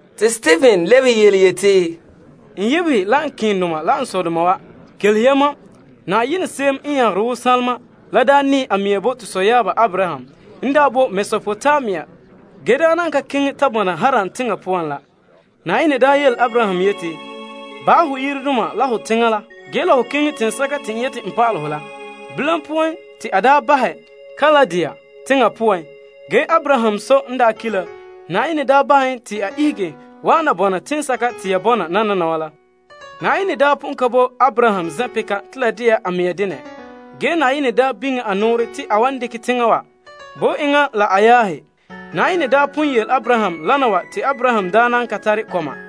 Te Stepen lebehe yeti, N sɔɔnrɔ la n sɔdoma wa, kelehe ya mam. Yenɛ se'em n de soŋadaana la daa nɛɛ a mea bo te sɔyaaba Abraham n daa boe Mesopotamia ge daa nan ka keŋɛ ta bɔna Haran teŋa poan la. Yenɛ daa yele Abraham yeti, Bahɛ ho teŋa wa, ho sɔɔnrɔ la ho sɔ yire nɛreba wa, ge keŋɛ teŋa kayema te n wan pa'alɛ hɔ. Bilam poan te a daa bahɛ Kaldea teŋa poan. Ge Abraham sɔ n daa ki' la, Yenɛ daa bahɛ en te a ihege wa'an na bɔna la teŋsɛka te ya bɔna nananawa la. Yenɛ daa pon ka bo Abraham zen'peka te la de'a a mea denɛ ge Yenɛ daa biŋe a nɔɔrɛ te a wan dekɛ teŋa wa bo enŋa la a yaahe. Yenɛ daa pon yele Abraham lana wa te Abraham daa nan ka tare kɔma.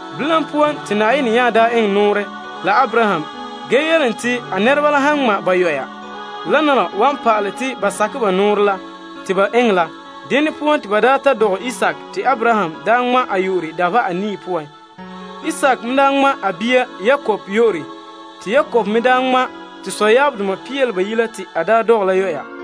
Bilam poan te Yenɛ nya daa eŋɛ nɔɔrɛ la Abraham ge yele en te a nɛreba la han ŋma', wana wa wan pa'alɛ te ba sakɛ ba nɔɔrɛ la te ba eŋɛ la. Dene poan te ba daa ta dɔgɛ Isaak te Abraham daa ŋma' en dabeha anii poan. Isaak me daa ŋma' a bia Yakob te Yakob me daa ŋma' to sɔyaabdoma pia la bayi' la te a daa dɔgɛ la boraanɛ.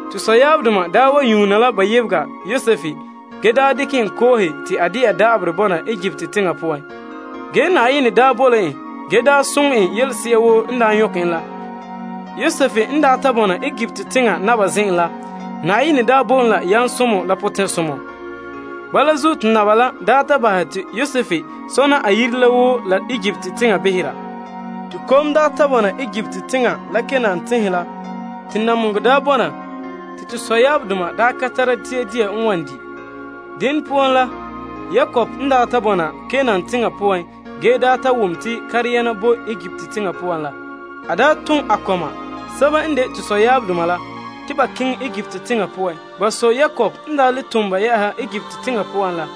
To sɔyaabdoma wa daa wa nyuuna la ba yebega Yosef ge daa dekɛ en koohe te a de'a da'aberɛ bɔna Egipt teŋa poan. Ge Yenɛ daa boe la en ge daa soŋɛ en la yelese'a woo n daa nyɔkɛ en la. Yosef n daa ta bɔna Egipt teŋa Naba zen'en la, Yenɛ daa bo en yamsomɔ la potɛn'soma. Bala zuo te naba la daa ta bahɛ te Yosef sɔna a yire la woo la Egipt teŋa behera. Te kom daa ta bɔna Egipt teŋa la Kanaan teŋhe poan te namehegɔ daa bɔna te to sɔyaabdoma daa ka tara dia dia wan di'. Dene poan la, Yakob n daa ta bɔna Kanaan teŋa poan ge daa ta wom te dia boe Egipt teŋa poan la, a daa ton a kɔma sɛba n de to sɔyaabdoma la, te ba keŋɛ Egipt teŋa poan. Ba sɔ Yakob n daa le ton ba yɛ'ɛha Egipt teŋa poan la,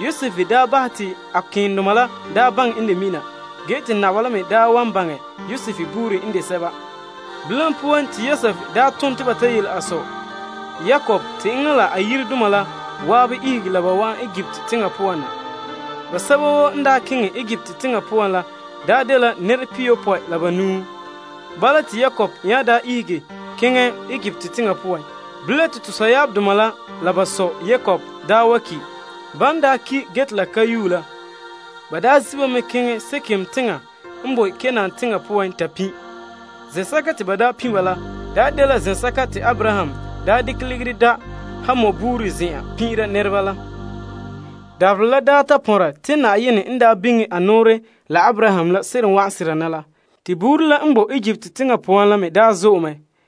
Yosef daa bahɛ te a keendoma la daa baŋɛ n de mina ge te naba la me daa wan baŋɛ Yosef buuri n de sɛba. Bilam poan te Yosef daa ton te ba ta yele a sɔ Yakob te enŋa la a yiredoma la zan'an ihege la ba wa'an Egipt teŋa poan na. Basɛba woo n daa keŋɛ Egipt teŋa poan la daa dela nɛra pihiyopɔe la banuu. Bala te Yakob nya daa ihege keŋɛ Egipt teŋa poan. Bilam te to sɔyaabdoma la la ba sɔ Yakob daa wa ki'. Ban daa ki' la, ba daa wa zi' la ba kɔnba keŋɛ Sekem teŋa n boe Kanaan teŋa poan ta pin'. Zen'sɛka te ba daa pin' ba la, daa dela zen'sɛka te Abraham daa dekɛ ligiri da' Hamor buuri zen'an pin'ira nɛreba la. Dabaherɛ la daa ta pɔnra te Yenɛ n daa biŋe a nɔɔrɛ la Abraham la seren wa'an sera na la, to buuri la n boe Egipt teŋa poan la me daa zo'e mɛ.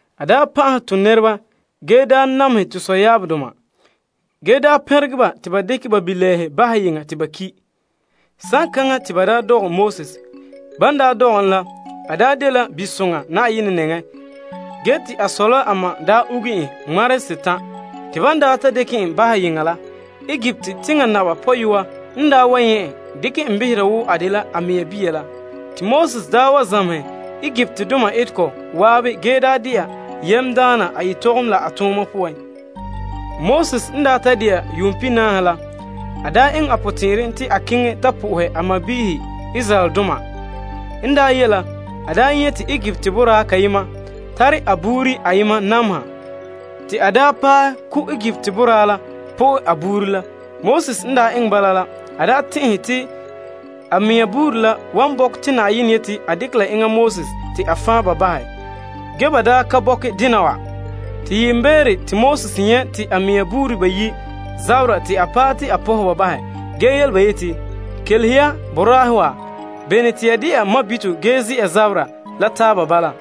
A daa pan'ahɛ to nɛreba ge daa namehɛ to sɔyaabdoma ge daa pɛnregɛ ba te ba dekɛ ba bilɛɛhe bahɛ yeŋa te ba ki'. Saŋkaŋa te ba daa dɔgɛ Moses. Ban daa dɔgɛ en la, a daa dela bisoŋa Yenɛ nɛŋa ge te a sɔ la a ma daa uge en yire ŋmarehe setan'. Te ban daa ta dekɛ en bahɛ yeŋa la, Egipt teŋa naba pɔyɔa n daa wa nyɛ' en, dekɛ en behera wo a dela a mea bia la. Te Moses daa wa zamehɛ Egiptdoma etegɔ zan'an ge daa de'a yamdaana a yetɔgom la a tooma poan. Moses n daa ta de'a yuun pihinaahe la, a daa eŋɛ a potɛn'ɛrɛ te a keŋɛ ta po'ohɛ a sɔɔnrɔ Israeldoma. N daa ye' la, a daa nyɛ' te Egipt boraa kayema tare a buuri ayema nameha te a daa paɛ ko' Egipt boraa la po'e a buuri la. Moses n daa eŋɛ bala la a daa tɛn'ɛhe te a mea buuri la wan bɔkɛ te Yenɛ yete a dekɛ la enŋa Moses te a fan' ba bahɛ, ge ba daa ka bɔkɛ dena wa. Te yiimbeere te Moses nyɛ' te a mea buuri bayi' zaberɛ te a paɛ te a pɔnhɛ ba bahɛ ge yele ba yeti, Kelehe ya boraahe wa, bene te ya de'a mabito ge ze'a zabera la taaba bala?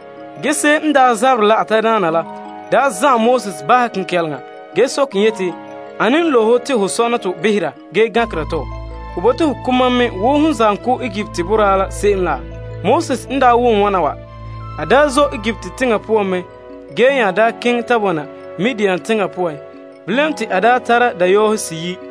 Ge se'em n daa zaberɛ la a tadaana la daa zan'ɛn Moses bahɛ kenkɛleŋa ge soke en yeti, Ane n bo ho sore te ho behera, ge gankera tomam? Ho yeti ho ko mam me wo hom zam ko Egipt nɛra la se'em la? Moses n daa ta wom wana wa, a daa zɔ' Egipt teŋa poan mɛ ge nya daa keŋɛ ta bɔna la Midian teŋa poan. Bilam te a daa ta tara dayɔɔhe seyi'.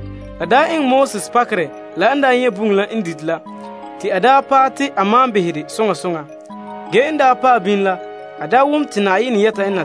La daa eŋɛ Moses pakerɛ la n daa nyɛ' bugum la n dite la, te a daa paɛ te a malom behɛ dɛ soŋa soŋa. Ge n daa paɛ bini la, a daa wom te Na'ayenɛ yɛta en na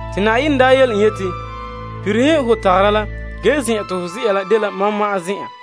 Te Na'ayenɛ daa yele en yeti, Pirihe ho tagara la. Se'ere n sɔe la, zen'sɛka te ho zɛ'a la dela toolom zen'an.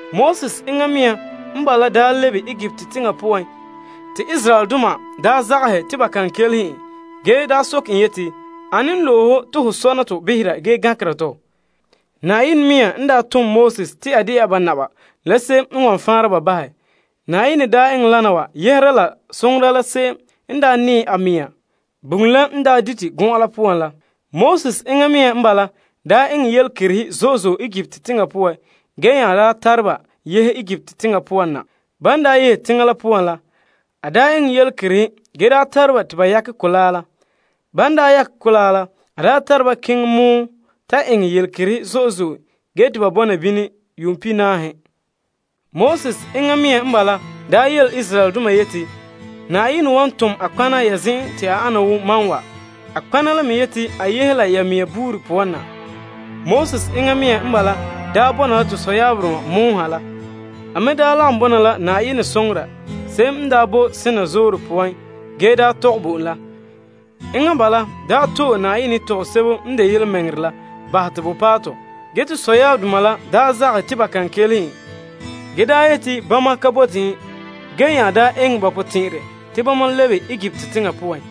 Moses enŋa mea n bala daa lebe Egipt teŋa la poan te Israeldoma daa zagahɛ te ba kan kelehe en ge daa soke en yeti, Ane loe ho te ho sɔna tɔ behera ge gankera tɔ? Yenɛ mea n daa tom Moses te a de'a ba naba la se'em n wan faanra ba bahɛ. Yenɛ daa eŋɛ wana wa yɛhera la soŋora se'em n daa nɛɛ a mea bugum la n daa dite gɔn'an la poan la. Moses enŋa mea n bala daa eŋɛ yelekerehe zo'e zo'e Egipt teŋa poan ge nya daa tare ba yehe Egipt teŋa la poan na. Ban daa yehe teŋa la poan la, a daa le eŋɛ yelekerehe ge daa tara ba te ba yakɛ Mɔgɔ Mɔlega la poan. Ban daa yakɛ kolaa la, a daa tare ba keŋɛ pɔgɔtia ta eŋɛ yelekerehe zo'e zo'e ge te ba bɔna bini yuum pihinaahe. Moses enŋa mea n bala daa yele Israeldoma yeti, Yenɛ la wan loe nɔtɔgɔha n ane wo mam la ya mɛŋa sɔɔnrɔ wa poan. Moses enŋa mea n bala daa bɔna la to sɔyaabdoma pɔgɔtia ha la. A me daa lagom bɔna la Yenɛ soŋora se'em n daa bo Sinai Zoore poan ge daa tɔgɛ bo en la. Enŋa bala daa to'e Yenɛ yetɔgom sebo n de yelemɛŋɛrɛ la te a bahɛ te bo paɛ tɔ. Ge to sɔyaabdoma la daa zagahɛ te ba kan kelehe en ge daa yete bama ka bote en ge nya daa ton eŋɛ la ba potɛn'ɛrɛ te bama le lebe Egipt teŋa poan.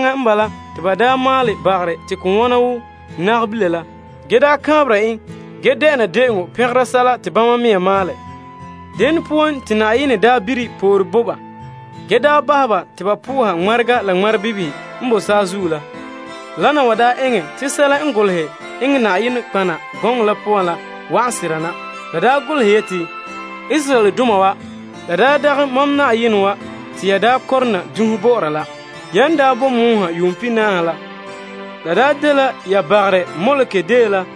Saŋkaŋa n bala te ba daa maalɛ bagarɛ te ko wona wo nagabila la ge daa kaanbera en ge de'ena de'eŋɔ pɛngera sɛla te bama mea maalɛ. Dene poan te Yenɛ daa bire pore bo ba ge daa bahɛ ba te ba po'oha ŋmarega la ŋmarebibihe n bo saazuo la. Wana wa daa eŋɛ te sɛla n golehɛ eŋɛ nɔtɔgɔheba gɔŋɔ la poan la wa'an sera na. La daa golehɛ yeti, Israeldoma wa, yamam n yuum boe pɔgɔtia la poan yuuma pihinaahe la, ya yuun ka bo'ore mam la kaanbegɔ bii ki bo'olom.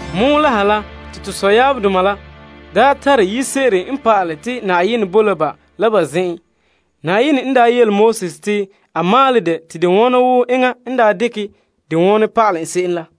Pɔgɔtia la ha la te to sɔyaabdoma la daa tare Sogorɛ la n pa'alɛ te Yenɛ boe la ba la ba zen'an. Yenɛ n daa yele Moses te a maalɛ dɛ te de ane wo enŋa n daa dekɛ dɛ wonɛ pa'alɛ en se'em la.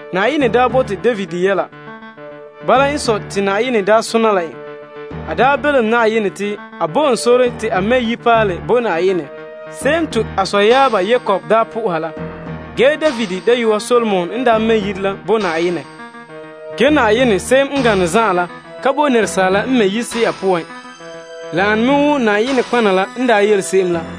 Yenɛ daa bote David yɛla. Bala n sɔe te Yenɛ daa sona la en. A daa belom Yenɛ te a bo en sore te a mɛ' yire bo Yenɛ se'em te a sɔyaaba Yakob daa me soha la. Ge David dayɔa Solomon n daa mɛ' yire la bo Yenɛ. Ge Na'ayenɛ se'em n gane zan'an la ka boe asaaleba n mɛ' yire se'a poan. La ane me wo Yenɛ nɔtɔgɔha la n daa yele se'em la.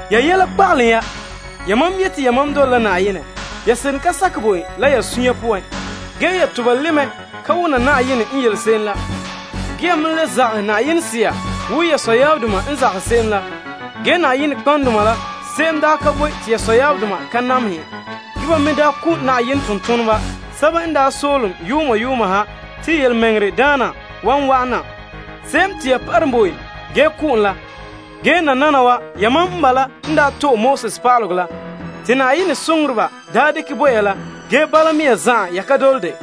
Ya yɛla kpagalom ya. Yamam yete yamam dole la Yenɛ, ge ya seren ka sakɛ bo en la ya sunya poan ge ya toba li' mɛ ka wona Yenɛ n yele se'em la. Ge ya me le zagahɛ Yenɛ Sea, wo ya sɔyaabdoma n zagahɛ se'em la. Ge nɔtɔgɔheba la se'em daa ka boe te ya sɔyaabdoma daa ka namehɛ ba. Ge ba me daa ko' Yenɛ bitonoŋa yuuma yuuma ha te Fa'a Daana wan wa'an na, se'em te ya parom bo en ge ko' en la. Ge nananawa yamam n bala n daa to'e Pa'alegɔ la te Yenɛ soŋoreba daa dekɛ bo ya la ge bala mea zan'an ya ka dole dɛ.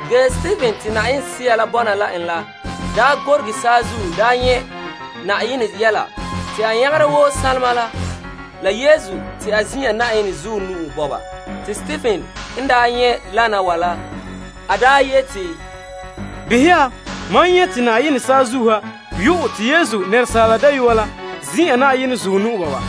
Ge Stepen te Yenɛ Sea la bɔna la en la gorege saazuo nyɛ' Yenɛ soŋa la Yesu te a ze'a Yenɛ zuɔ nu'o. Te Stepen yeti, Behɛ ya, mam nyɛ' te yenɛ saazuo ha yu'ɛ, te Yesu, Asaala Dayɔa la ze'a Yenɛ zuɔ nu'o.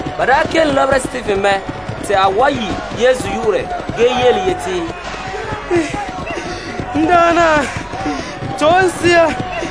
Ba kelom lɔbera Stepen mɛ te a wa yi' Yesu yu'urɛ ge yeti, N Daana, to'e n sea.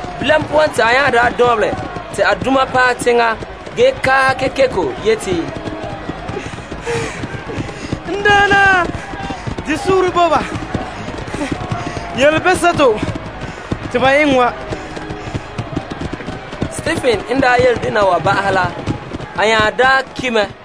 Bilam poan te a nya lu' teŋa ge kaahɛ kekeko yeti, N Daana, bahɛ ba yelebeseto te ba eŋɛ wa. Stepen n yele dena wa ba'ahɛ la, a nya ki' mɛ.